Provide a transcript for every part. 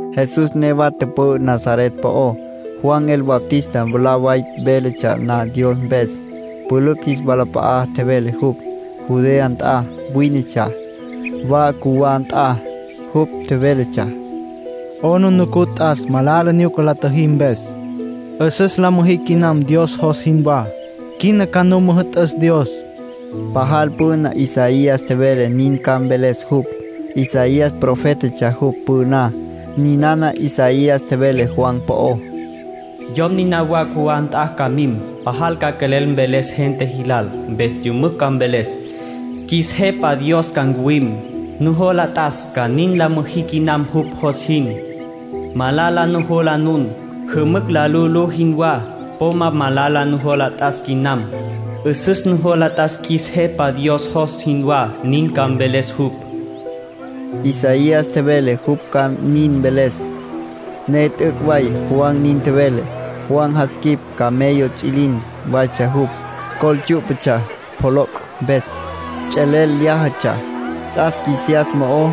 Jesús newa tüpü'ü Nazaret po'ó, Juan el Bautista mwalá way véletsja na Dios mpes. Pülücj jis walap'a'a tjevele jupj. Judea nt'a wínetsja, wa cjuwá nt'a. Jupj tjevéletsja: “'Aplijila t'as malala nyuca la tjüjí mpes. 'Üsüs la müjí quinam Dios jos jinwá. Quina ca nu müjü'tüs Dios”, tjevele jupj. Pajal püna Isaías tjevele nin ca mveles jupj. Isaías profétatsja jupj püná. Ninana Isaías tjevele Juan po'ó: “Yom niná wa cjuwá nt'a ca mim. Pajal ca quelel mveles gente jilal. Mpes yümücj ca mveles: ‘Qjuis Jepa Dios ca ncuwim. Nujola t'as ca nin la müjí quinam jupj jos jin. Malala nujola nun, jümücj la lu'ulú jinwá. Po ma malala nujola t'as quinam. 'Üsüs nujola t'as qjuis Jepa Dios jos jinwá’ nin ca mveles jupj.” Isaías tjevele jupj ca nin mveles, ne t'üc' way Juan nin tjevele. Juan jas quip camello ts'üilin waytsja jupj. Col tsyú'patsja pjoloc' mpes. Ts'elel lyájatsja. Ts'as qjuisiyas mo'o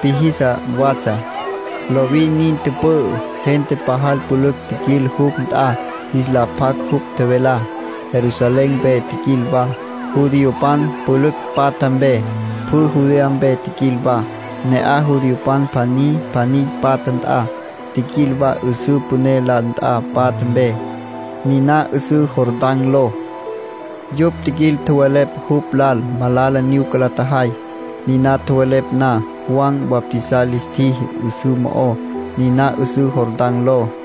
píjisa watsja. Lovin nin tüpü'ü. Gente pajal pülücj tjiquil jupj nt'a jis la pjac jupj tjevelá. Jerusalén mpe tjiquil wa, judiopan pülücj patja mpe. Pjü Judea mpe tjiquil wa, ne'aj judiopan pjaní pjaní patja nt'a. Tjiquil wa 'üsǘ püné la nt'a patja mpe, niná 'üsǘ Jordán ló. Yupj tjiquil, tjowelepj jupj lal malala nyuca la tjajay. Niná tjowelepj na, Juan bautizar lis tjiji 'üsǘ mo'ó, niná 'üsǘ Jordán ló.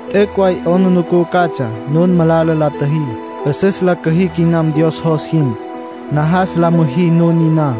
T'üc' way 'aplijila catsja nun malala la tjüjí, 'üsüs la cüjí quinam Dios jos jin. Najas la müjí nun niná.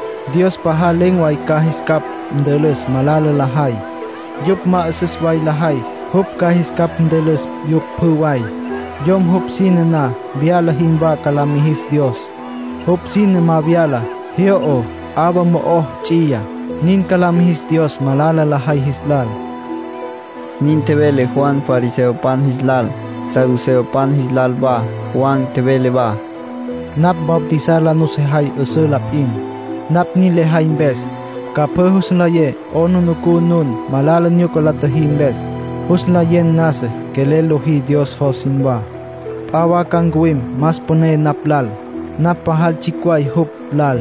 Dios pajal len̈ way ca jis capj ntülüs malala lajay. Yupj ma 'üsüs way lajay, jupj ca jis capj ntülüs yupj pjü way. Yom jupj sine ma vyala jinwá ca la mijis Dios. Jupj sine ma vyala, jyo'o, 'awa mo'o ts'iyá. Nin ca la mijis Dios malala lajay jis lal”, nin tjevele Juan fariseopan jis lal, saduceopan jis lal wa. Juan tjevele wa: “Napj bautizar la nusejay 'üsǘ lal p'in. Napj nin lejay mpes, ca pjü jus nlayecj 'aplijila nun malala nyuca la tjüjí mpes. Jus nlayecj nasa quelel lojí Dios jos jinwá. P'a wa ca ncuwim más püné napj lal. Napj pajal tsjicj way jupj lal.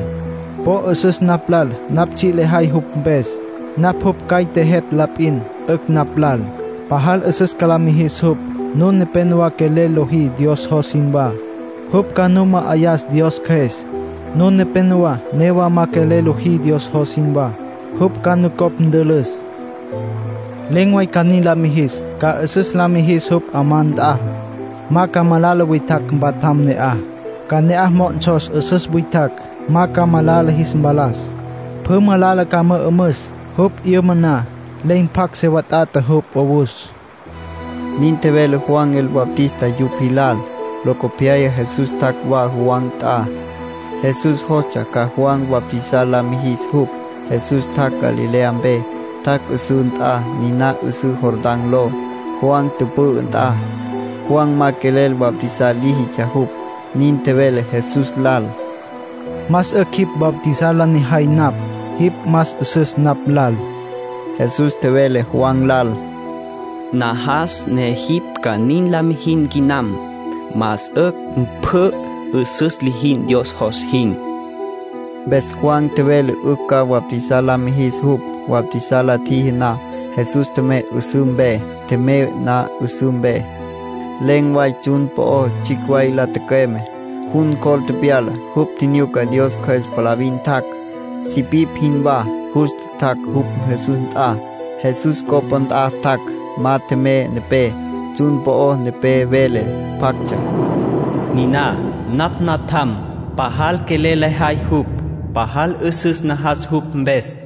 Po 'üsüs napj lal napj tsji' lejay jupj mpes. Napj jupj caite jet' la p'in, 'ücj napj lal. Pajal 'üsüs ca la mijis jupj. Nun nepénowa quelel lojí Dios jos jinwá. Jupj ca nu ma'ayas Dios Cjües. Nun nepénowa newa ma quelel lojí Dios jos jinwá. Jupj ca nucopj ntülüs. Len̈ way ca nin la mijis. Ca 'üsüs la mijis jupj 'amá nt'a, ma ca malala witjacj mpatjam ne'aj. Ca ne'aj mo'onsos 'üsüs witjacj, ma ca malala jis mpalas. Pjü malala ca mü'ümüs. Jupj 'yüma na, len̈ pjacj se wat'ata jupj 'owus”, nin tjevele Juan el Bautista yupj jis lal. Locopyaya Jesús tjac' wa Juan nt'a. Jesús jostsja ca Juan bautizar la mijis jupj. Jesús tjac' Galilea mpe. Tjac' 'üsǘ nt'a, niná 'üsǘ Jordán ló, Juan tüpü'ü nt'a. Juan ma quelel bautizar líjitsja jupj. Nin tjevele Jesús lal: —Más 'ücj jipj bautizar la nejay napj. Jipj más 'üsüs napj lal. Jesús tjevele Juan lal: —Najas ne jipj ca nin la mijin quinam. Más 'ücj pjü 'üsüs lijicj Dios jos jin. Mpes Juan tjevele 'ücj ca bautizar la mijis jupj. Bautizar la tjiji na, Jesús tjemey 'üsǘ mpe. Tjemey na 'üsǘ mpe, len̈ way tsjun po'o tsjicj way la tücüeme, jun cjol tepyala. Jupj tjinyuca Dios Cjües palavin tjac'. Sipipj jinwá justa tjac' jupj Jesús nt'a. Jesús copá nt'a tjac'. Ma tjemey nepé. Tsjun po'o nepé vele pjactsja: “Niná napj Natjam. Pajal quelel lejay jupj. Pajal 'üsüs najas jupj mpes.”